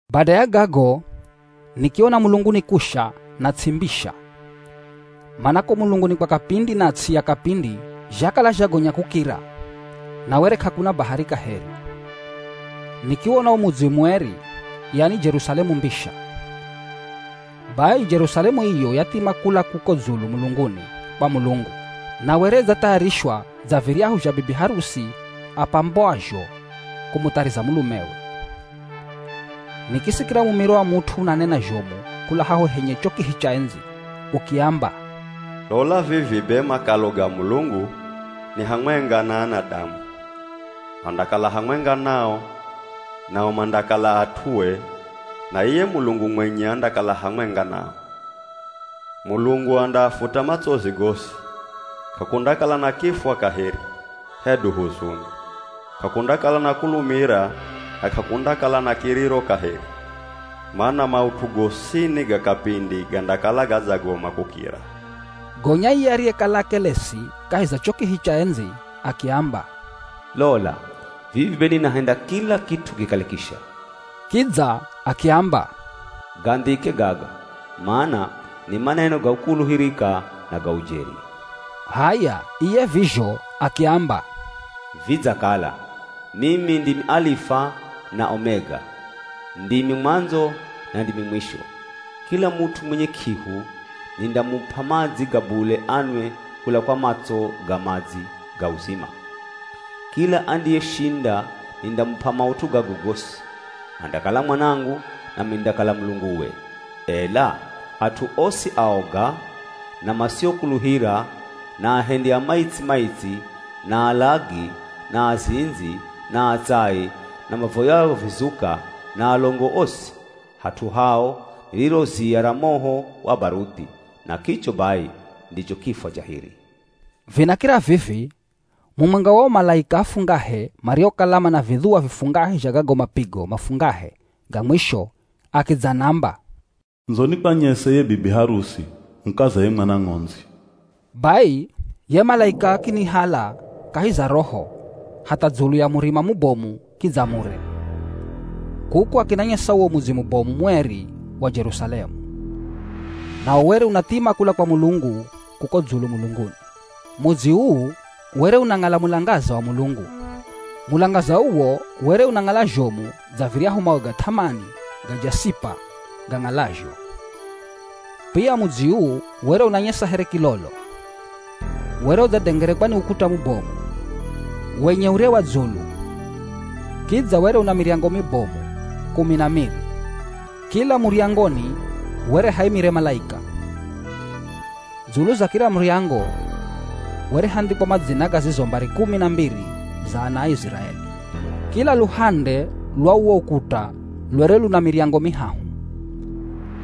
Bada ya gago, nikiona mulunguni kusha na ts'i mbisha, mana ko mulunguni kwa kapindi na ts'i ya kapindi zhakala zhagonya kukira, na were k'akuna bahari kaheri. Nikiwona wo Mudzi Mueri, yani Jerusalemu mbisha. Bai Jerusalemu iyo yathima kula kuko dzulu mulunguni kwa Mulungu, na were idzathayarishwa dza viryahu zha bibi harusi apambwazho kumuthariza mulumewe. Nikisikira mumiro wa mut'u unanena zhomu kula haho henye cho kihi cha endzi. Ukiamba, “Lola vivi be makalo ga Mulungu, ni hamwenga na anadamu. Andakala hamwenga nao, nao mandakala at'ue na iye Mulungu mwenye andakala hamwenga nao. Mulungu andaafuta matsozi gosi. K'akundakala na kifwa kaheri, hedu huzuni. K'akundakala na kulumira na k'akundakala na kiriro kaheri. Mana maut'u gosini ga kapindi gandakala gadzagoma kukira.” Gonya iye ariyekala akelesi kahi za cho kihi cha endzi akiamba, “Lola vivi be ninahenda kila kit'u kikale kisha.” Kidza akiamba, “Gandhike gaga, mana ni maneno ga kukuluhirika na ga ujeri.” H'aya iye vizho, akiamba, “Vidzakala! Mimi ndimi Alifa na Omega. Ndimi mwandzo na ndimi mwisho. Kila mut'u mwenye k'ihu, nindamup'a madzi ga bule anwe kula kwa matso ga madzi ga uzima. Kila andiyeshinda nindamup'a maut'u gago gosi. Andakala mwanangu, nami nindakala Mulunguwe. Ela at'u osi aoga, na masiokuluhira, na ahendi a maitsi-maitsi, na alagi, na azindzi, na atsai, na mavoyao vizuka, na alongo osi, hat'u hao ni riro ziya ra moho wa baruthi. Na kicho bai ndicho kifwa cha hiri.” Vinakira vivi, mumwenga wa o malaika afungahe mariokala mana vidhuwa vifungahe zha gago mapigo mafungahe ga mwisho akidzanamba, “Ndzo nikwanyese ye bibi harusi, mukaza ye Mwana Ng'ondzi.” Bai ye malaika akinihala kahi za Roho hatha dzulu ya murima mubomu kidza mure. Kuko, akinanyesa uwo mudzi mubomu mueri wa Jerusalemu. Nawo were unathima kula kwa Mulungu kuko dzulu mulunguni. Mudzi uu were unang'ala mulangaza wa Mulungu. Mulangaza uwo were unang'ala zhomu dza viryahu mawe ga th'amani ga jasipa gang'alazho. Pia mudzi uu were unanyesa here kilolo. Were udzadengerekwa ni ukuta mubomu, wenye ure wa dzulu. Kidza were una miryango mibomu, kumi na miri. Kila muryangoni were haimire malaika. Dzulu za kila muryango, were handhikwa madzina ga zizo mbari kumi na mbiri za ana a Iziraeli. Kila luhande lwa uwo ukuta lwere luna miryango mihahu.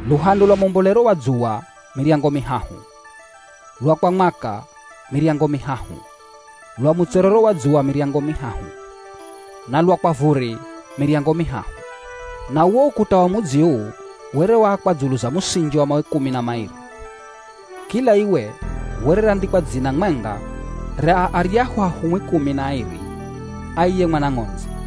Luhande lwa mwambolero wa dzuwa miryango mihahu, lwa kwa mwaka miryango mihahu, lwa mutserero wa dzuwa miryango mihahu, na lwa kwa vuri miryango mihahu. Na uwo ukuta wa mudzi uu were waakwa dzulu za musinji wa mawe kumi na mairi. Kila iwe were randhikwa dzina mwenga ra aryahu ahumwi kumi na airi a iye Mwana Ng'ondzi.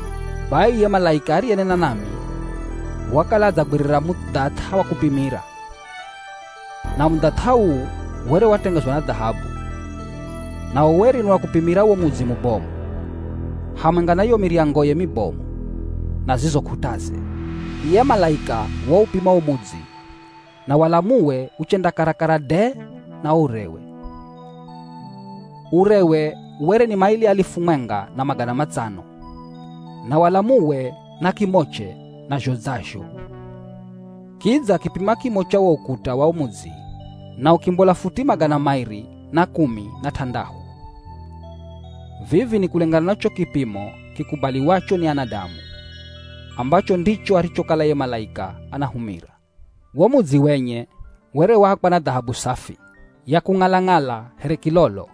Bai iye malaika ariyenena nami, wakala adzagwirira mudhath'a wa kupimira. Na mudhath'a uu were watengezwa na dhahabu. Nawo were ni wa kupimira wo mudzi mubomu, hamwenga na yo miryangoye mibomu, na zizo k'ut'aze. Iye malaika waupima wo mudzi na walamuwe uchenda karakara de na urewe. Urewe were ni maili alifu mwenga na magana matsano, na walamuwe na kimoche nazho dza zho. Kidza akipima kimo cha wo ukuta wa wo mudzi na ukimbola futi magana mairi na kumi na t'andahu. Vivi ni kulengana na cho kipimo kikubaliwacho ni anadamu, ambacho ndicho arichokala ye malaika anahumira. Wo mudzi wenye were waakwa na dhahabu safi, ya kung'ala-ng'ala here kilolo.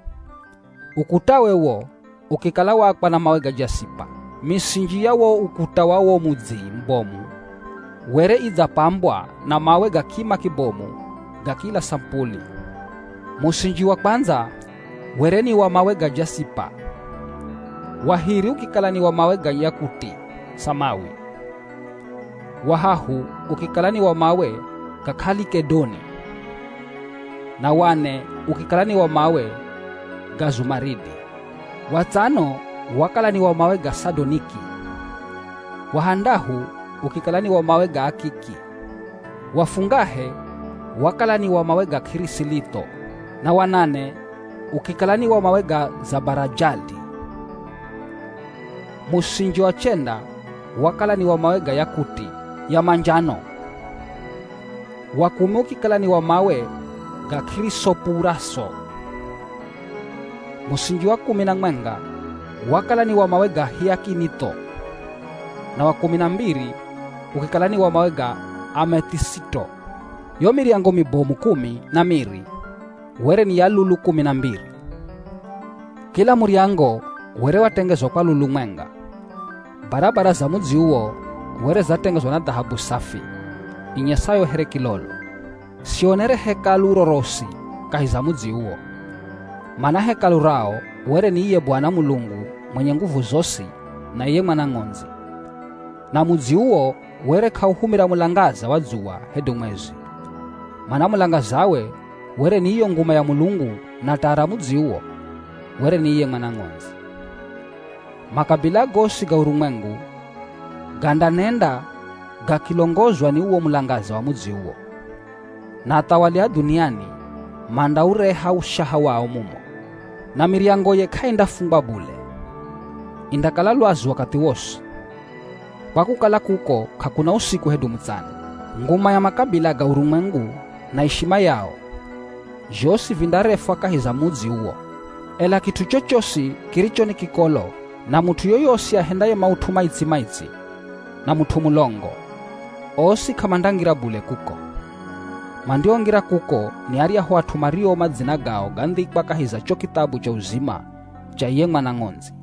Ukutawe wo ukikala waakwa na mawe ga jasipa. Misinji ya wo ukuta wa wo mudzi mubomu were idzapambwa na mawe ga kima kibomu ga kila samupuli. Musinji wa kwandza were ni wa mawe ga jasipa, wa hiri ukikala ni wa mawe ga yakuti samawi, wa hahu ukikala ni wa mawe ga kalikedoni, na wa ne ukikala ni wa mawe ga zumaridi. Wa tsano wakala ni wa mawe ga sadoniki, wa handahu ukikala ni wa mawe ga akiki, wa fungahe wakala ni wa mawe ga kirisilitho, na wa nane ukikala ni wa mawe ga zabarajadi. Musinji wa chenda wakala ni wa mawe ga yakuti ya manjano, wa kumi ukikala ni wa mawe ga kirisopuraso. Musinji wa kumi na mwenga wakala ni wa mawe ga hiakinitho, na wa kumi na mbiri ukikala ni wa mawe ga amethisito. Yo miryango mibomu kumi na miri were ni ya lulu kumi na mbiri. Kila muryango were watengezwa kwa lulu mwenga. Barabara za mudzi uwo were zatengezwa na dhahabu safi, inyesayo here kilolo. Sionere Hekalu rorosi kahi za mudzi uwo. Mana Hekalu rao were ni iye Bwana Mulungu, mwenye nguvu zosi na iye Mwana Ng'ondzi. Na mudzi uwo were k'auhumira mulangaza wa dzuwa hedu mwezi, mana mulangazawe were ni iyo nguma ya Mulungu na taa ra mudzi uwo were ni iye Mwana Ng'ondzi. Makabila gosi ga urumwengu gandanenda gakilongozwa ni uwo mulangaza wa mudzi uwo. Na athawali a dhuniani mandaureha ushaha wao mumo. Na miryangoye k'aindafungwa bule, indakala lwazu wakathi wosi, kwa kukala kuko k'akuna usiku hedu mutsana. Nguma ya makabila ga urumwengu na ishima yao, zhosi vindarefwa kahi za mudzi uwo. Ela kit'u chochosi kiricho ni kikolo, na mut'u yoyosi ahendaye maut'u maitsi-maitsi, na mut'u mulongo, osi k'amandangira bule kuko. Mandiongira kuko ni aryahu at'u mario madzina gao gandhikwa kahi za cho kithabu cha uzima cha iye Mwana Ng'ondzi.